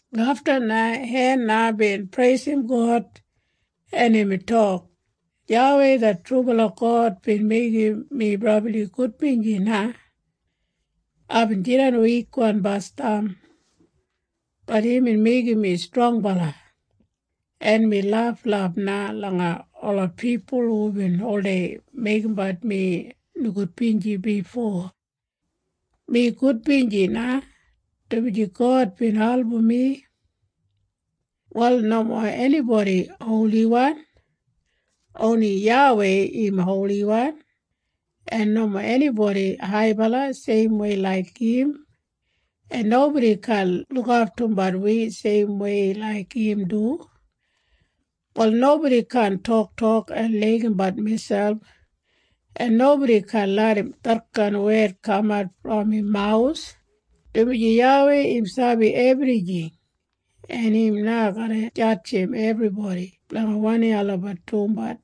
Afta na Hena bin preisim God, en imbin tok, “YAWEI det trubala God bin meigim mi brabli gudbinji na. Aibin jidan wikwan basdam. Bat imbin meigim mi strongbala, en mi laflaf na langa ola pipul hubin oldei meigimbat mi nogudbinji bifo. Mi gudbinji na, dumaji God bin album mi. “Wal nomo enibodi holiwan. Oni YAWEI im holiwan. En nomo enibodi haibala seimwei laik im, en nobodi kaan lukaftumbat wi seimwei laik im du. “Wal nobodi kaan toktok en laigimbat miselp, en nobodi kaan larram detkain wed kamat brom im mawus, dumaji YAWEI im sabi ebrijing, en im na garra jadjim ebribodi blanga wanim olabat dumbat.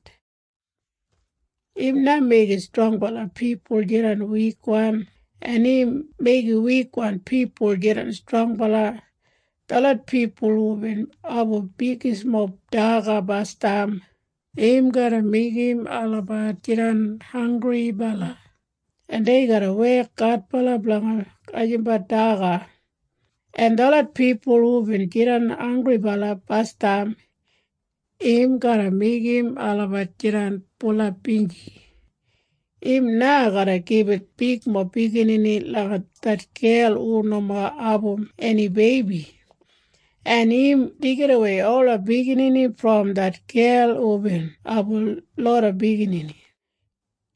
“Im na meigim strongbala pipul jidan wikwan, en im meigim wikwan pipul jidan strongbala. Detlot pipul hubin abum bigismob daga basdam, im garra meigim olabat jidan hanggribala, en dei garra wek adbala blanga gajimbat daga. En detlot pipul hubin jidan hanggribala basdam, im garra meigim olabat jidan bulap binji. Im na garra gibit bigmob biginini langa det gel hu nomo abum eni beibi, en im deigidawei ola biginini brom det gel hubin abum loda biginini.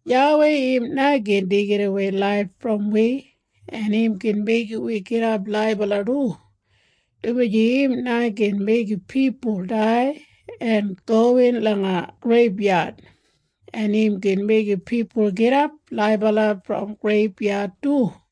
“YAWEI im na gin deigidawei laif brom wi, en im gin meigim wi gidap laibala du, dumaji im na gin meigim pipul dai en gowin langa greibyad, en im gin meigim pipul gidap laibala brom greibyad du.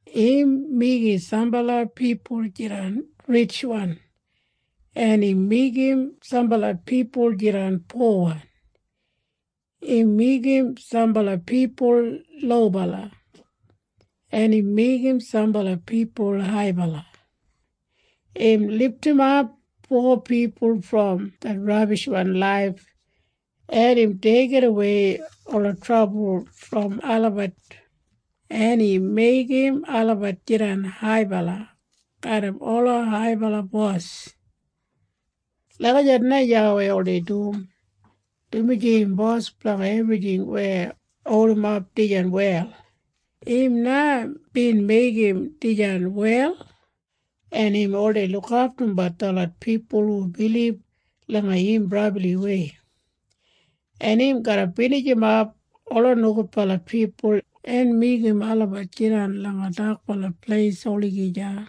“Im meigim sambala pipul jidan ritjwan, en im meigim sambala pipul jidan powan. Im meigim sambala pipul lobala, en im meigim sambala pipul haibala. Im lidimap po pipul brom det rabishwan laif, en im deigidawei ola trabul brom olabat, en im meigim olabat jidan haibala garram ola haibala bos. “Lagijat na YAWEI oldei dum, dumaji im bos blanga ebrijing weya holdimap dijan wel. Im na bin meigim dijan wel, en im oldei lukaftumbat detlot pipul hu bilib langa im brabliwei, en im garra binijimap ola nogudbala pipul en meigim olabat jidan langa dakbala pleis olagija.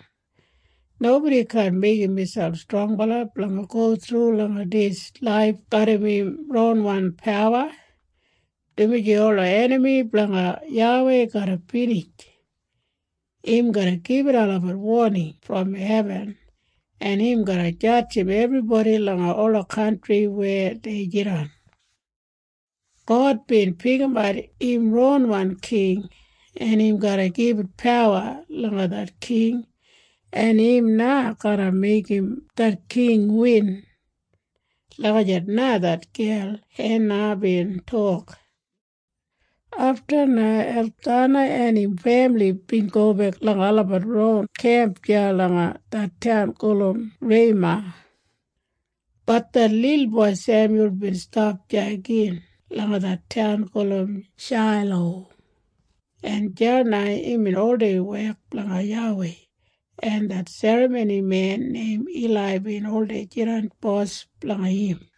Nobodi kaan meigim miselp strongbala blanga go thru langa dis laif garram im ronwan pawa, dumaji ola enami blanga YAWEI garra binij. Im garra gibit olabat woning brom hebin, en im garra jadjim ebribodi langa ola kantri weya dei jidan. “God bin pikimat im ronwan king, en im garra gibit pawa langa det king, en im na garra meigim det king win.” Lagijat na det gel Hena bin tok. Afta na Elkana en im femili bin gobek langa olabat ron kemp deya langa det taun gulum Rema. Bat det lilboi Semyul bin stap deya gin langa det taun gulum Shailo, en deya na imbin oldei wek blanga YAWEI, en det serramonimen neim Ilai bin oldei jidan bos blanga im.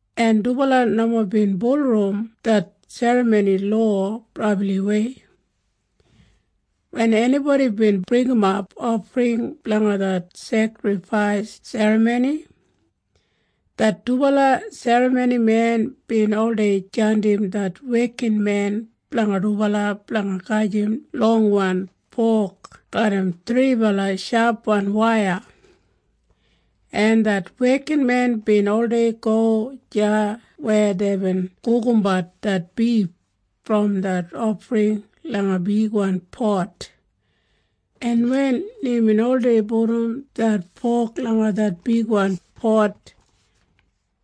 en dubala nomo bin bulurrum det serramoni lowa brabliwei. Wen enibodi bin bringimap ofring blanga det sekrifais serramoni, det dubala serramonimen bin oldei jandim det wekinmen blanga dubala blanga gajim longwan fok garram thribala shapwan waiya, en det wekinmen bin oldei go deya weya deibin gugumbat det bif brom det ofring langa bigwan pot, en wen imbin oldei pudum det fok langa det bigwan pot,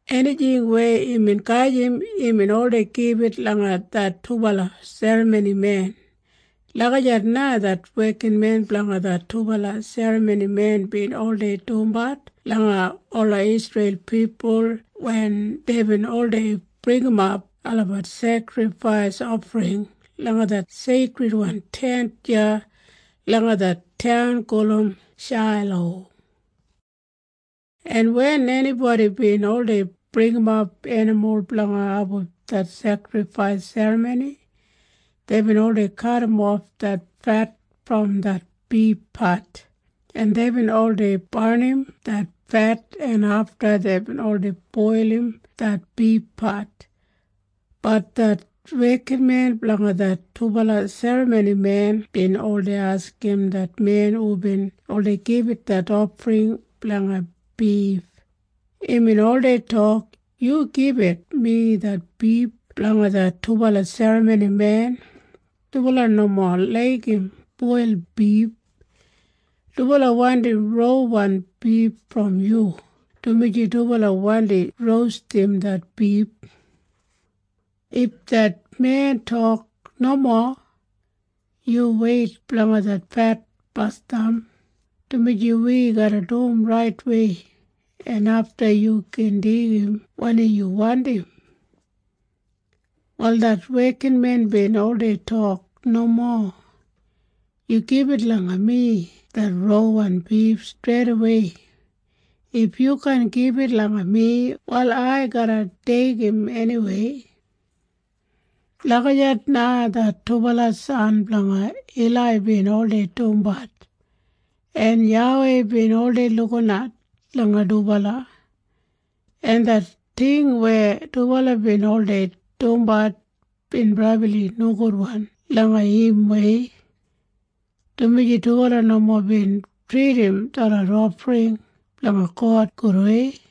enijing weya imbin gajim imbin oldei gibit langa det dubala serramonimen. Lagijat na det wekinmen blanga det dubala serramonimen bin oldei dumbat langa ola Isreil pipul wen deibin oldei bringimap olabat sekrifais ofring langa det Seikridwan Tent deya langa det taun gulum Shailo. En wen enibodi bin oldei bringimap enimul blanga abum det sekrifais serramoni, deibin oldei kadimof det fet brom det bifpat, en deibin oldei barnim det fet, en afta deibin oldei boilim det bifpat. Bat det wekinmen blanga det dubala serramonimen bin oldei askim det men hubin oldei gibit det ofring blanga bif. Imbin oldei tok, “Yu gibit mi det bif blanga det dubala serramonimen. Dubala nomo laigim boilwan bif. Dubala wandim rauwan bif brom yu, dumaji dubala wandi rostim det bif.” If det men tok, “Nomo. Yu weit blanga det fet basdam, dumaji wi garra dum raitwei, en afta yu gin deigim wanim yu wandim.” Wal det wekinmen bin oldei tok, “Nomo. Yu gibit langa mi det rauwan bif streidawei. If yu kaan gibit langa mi, wal ai garra deigim eniwei.” Lagijat na det dubala san blanga Ilai bin oldei dumbat, en YAWEI bin oldei lukinat langa dubala, en det ting weya dubala bin oldei dumbat bin brabli nogudwan langa imwei, dumaji dubala nomo bin tridim detlot ofring blanga God gudwei.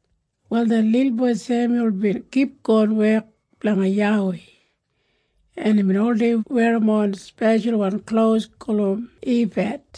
Wal det lilboi Semyul bin kipgon wek blanga YAWEI, en imbin oldei werrimon speshalwan klos gulum ifad.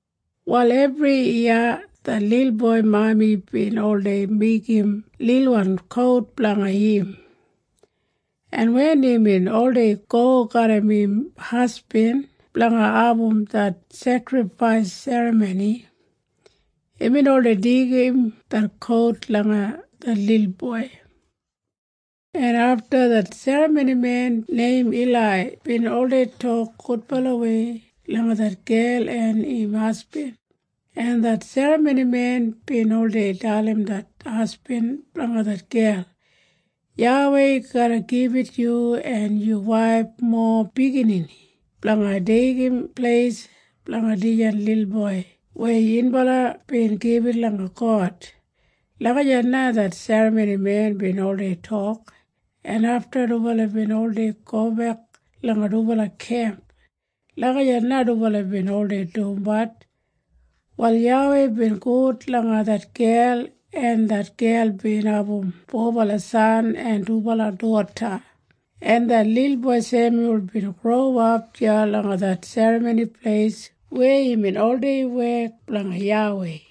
Wal ebriyiya det lilboi mami bin oldei meigim lilwan kout blanga im, en wen imbin oldei go garram im hasbin blanga abum det sekrifais serramoni, imbin oldei deigim det kout langa det lilboi. En afta det serramonimen neim Ilai bin oldei tok gudbalawei langa det gel en im hasbin, en det serramonimen bin oldei dalim det hasbin blanga det gel, “YAWEI garra gibit yu en yu waif mowa biginini blanga deigim pleis blanga dijan lilboi weya yunbala bin gibit langa God.” Lagijat na det serramonimen bin oldei tok, en afta dubala bin oldei gobek langa dubala kemp. Lagijat na dubala bin oldei dumbat. Wal YAWEI bin gud langa det gel, en det gel bin abum fobala san en dubala doda, en det lilboi Semyul bin growap deya langa det Serramoni Pleis weya imbin oldei wek blanga YAWEI.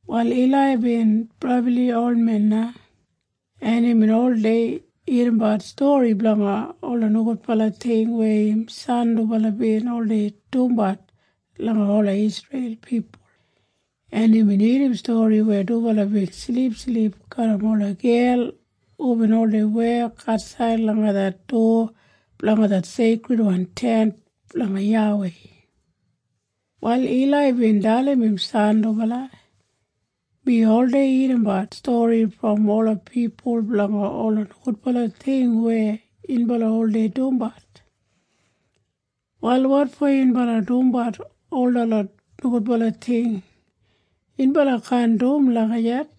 Wal Ilai bin brabli olmen na, en imbin oldei irrimbat stori blanga ola nogudbala ting weya im san dubala bin oldei dumbat langa ola Isreil pipul, en imbin irrim stori weya dubala bin silipsilip garram ola gel hubin oldei wek atsaid langa det dowa blanga det Seikridwan Tent blanga YAWEI. Wal Ilai bin dalim im san dubala, “Mi oldei irrimbat stori brom ola pipul blanga ola nogudbala ting weya yunbala oldei dumbat. Wal wotfo yunbala dumbat ol detlot nogudbala ting? Yunbala kaan dum lagijat,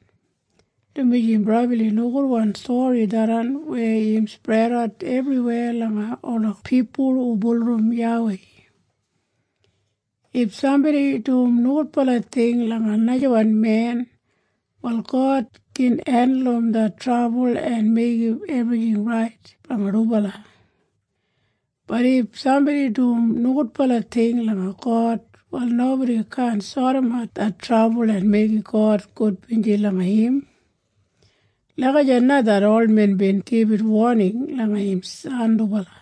dumaji im brabli nogudwan stori tharran weya im spredat ebriweya langa ola pipul hu bulurrum YAWEI. If sambodi dum nogudbala ting langa najawan men, wal God gin hendulum det trabul en meigim ebrijing rait blanga dubala. Bat if sambodi dum nogudbala ting langa God, wal nobodi kaan sodimat det trabul en meigim God gudbinji langa im.” Lagijat na det olmen bin gibit woning langa im san dubala.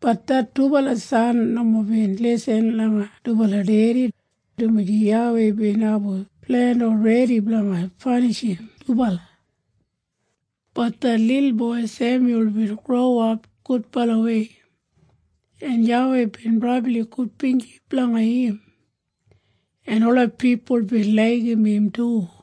Bat det dubala san nomo bin lisin langa dubala dedi, dumaji YAWEI bin abum plen olredi blanga panishim dubala. Bat det lilboi Semyul bin growap gudbalawei, en YAWEI bin brabli gudbinji blanga im, en ola pipul bin laigim im du.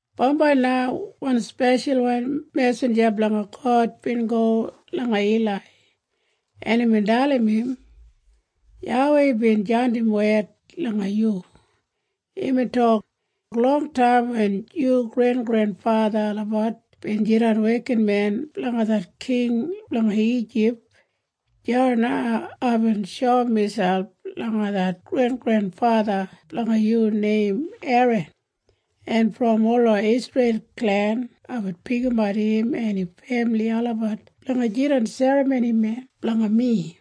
Bambai na wan speshalwan mesinja blanga God bin go langa Ilai, en imbin dalim im, “YAWEI bin jandim wed langa yu. Imbin tok, ‘Longtaim wen yu grengrenfatha olabat bin jidan wekinmen blanga det king blanga Ijip, deya na aibin shoum miselp langa det grengrenfatha blanga yu neim Eran, en brom ola Isreil klen aibin pikimat im en im femili olabat blanga jidan serramonimen blanga mi.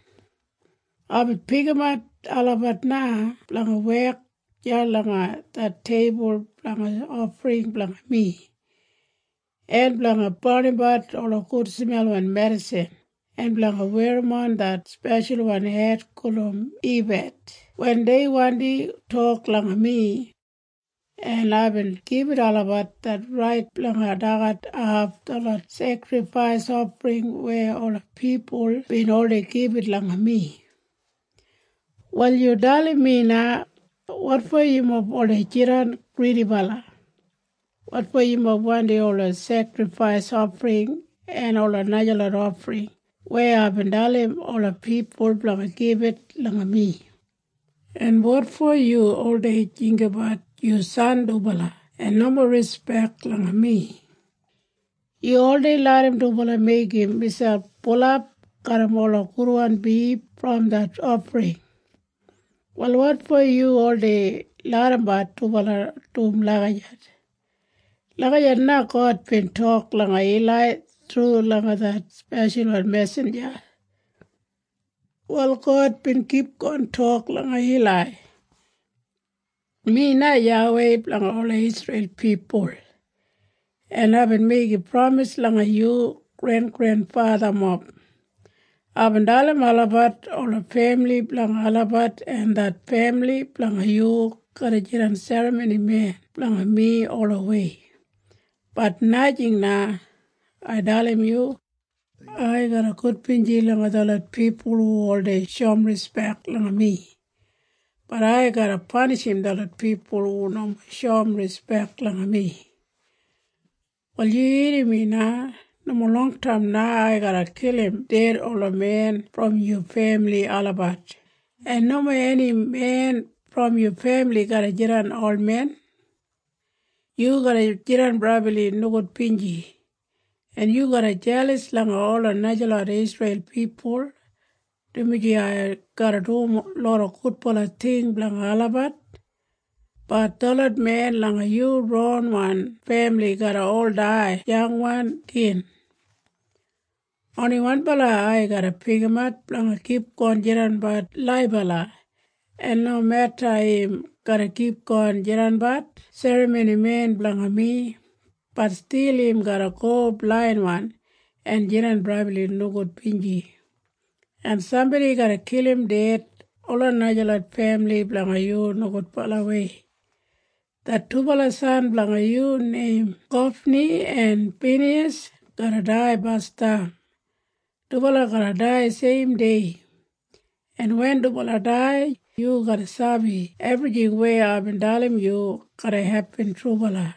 Aibin pikimat olabat na blanga wek deya langa det teibul blanga ofring blanga mi, en blanga barnimbat ola gudsmelwan medisin, en blanga werrimon det speshalwan shet gulum ifad wen dei wandi tok langa mi. En aibin gibit olabat det rait blanga dagat haf detlot sekrifais ofring weya ola pipul bin oldei gibit langa mi. “‘Wal yu dalim mi na. Wotfo yumob oldei jidan gridibala? Wotfo yumob wandim ola sekrifais ofring en ola najalot ofring weya aibin dalim ola pipul blanga gibit langa mi? En wotfo yu oldei jinggabat yu san dubala en nomo rispek langa mi? Yu oldei larram dubala meigim miselp bulap garram ola gudwan bif brom det ofring. Wal wotfo yu oldei larrambat dubala dum lagijat?’” Lagijat na God bin tok langa Ilai thru langa det speshalwan mesinja. Wal God bin kipgon tok langa Ilai, “Mi na YAWEI blanga ola Isreil pipul, en aibin meigim pramis langa yu grengrenfathamob. Aibin dalim olabat ola femili blanga olabat en det femili blanga yu garra jidan serramonimen blanga mi olawei. Bat najing na. Ai dalim yu. Ai garra gudbinji langa detlot pipul hu oldei shoum rispek langa mi. Bat ai garra panishim detlot pipul hu nomo shoum rispek langa mi. “Wal yu irrim mi na. Nomo longtaim na ai garra kilim ded ola men brom yu femili olabat, en nomo eni men brom yu femili garra jidan olmen. Yu garra jidan brabli nogudbinji, en yu garra jelas langa ola najalot Isreil pipul, dumaji ai garra dum loda gudbala ting blanga olabat. Bat detlot men langa yu ronwan femili garra ol dai yangwan gin. Oni wanbala ai garra pikimat blanga kipgon jidanbat laibala, en nomeda im garra kipgon jidanbat serramonimen blanga mi, bat stil im garra go blainwan en jidan brabli nogudbinji, en sambodi garra kilim ded ola najalot femili blanga yu nogudbalawei. Det dubala san blanga yu neim Hofni en Finiyas garra dai basdam. Dubala garra dai seimdei, en wen dubala dai, yu garra sabi ebrijing weya aibin dalim yu garra hepin trubala.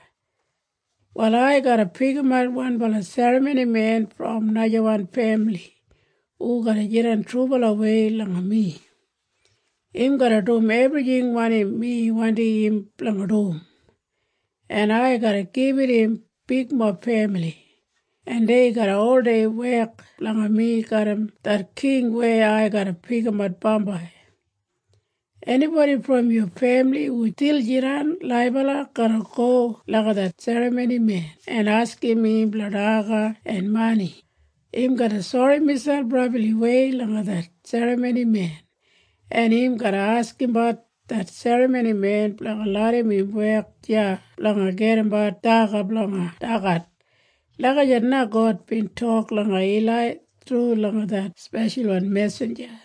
“Wal ai garra pikimat wanbala serramonimen brom najawan femili hu garra jidan trubalawei langa mi. Im garra dum ebrijing wanim mi wandim im blanga dum, en ai garra gibit im bigmob femili, en dei garra oldei wek blanga mi garram det king weya ai garra pikimat bambai. Enibodi brom yu femili hu stil jidan laibala garra go langa det serramonimen en askim im blanga daga en mani. Im garra sori miselp brabliwei langa det serramonimen, en im garra askimbat det serramonimen blanga larram im wek deya blanga gedimbat daga blanga dagat.” Lagijat na God bin tok langa Ilai thru langa det speshalwan mesinja.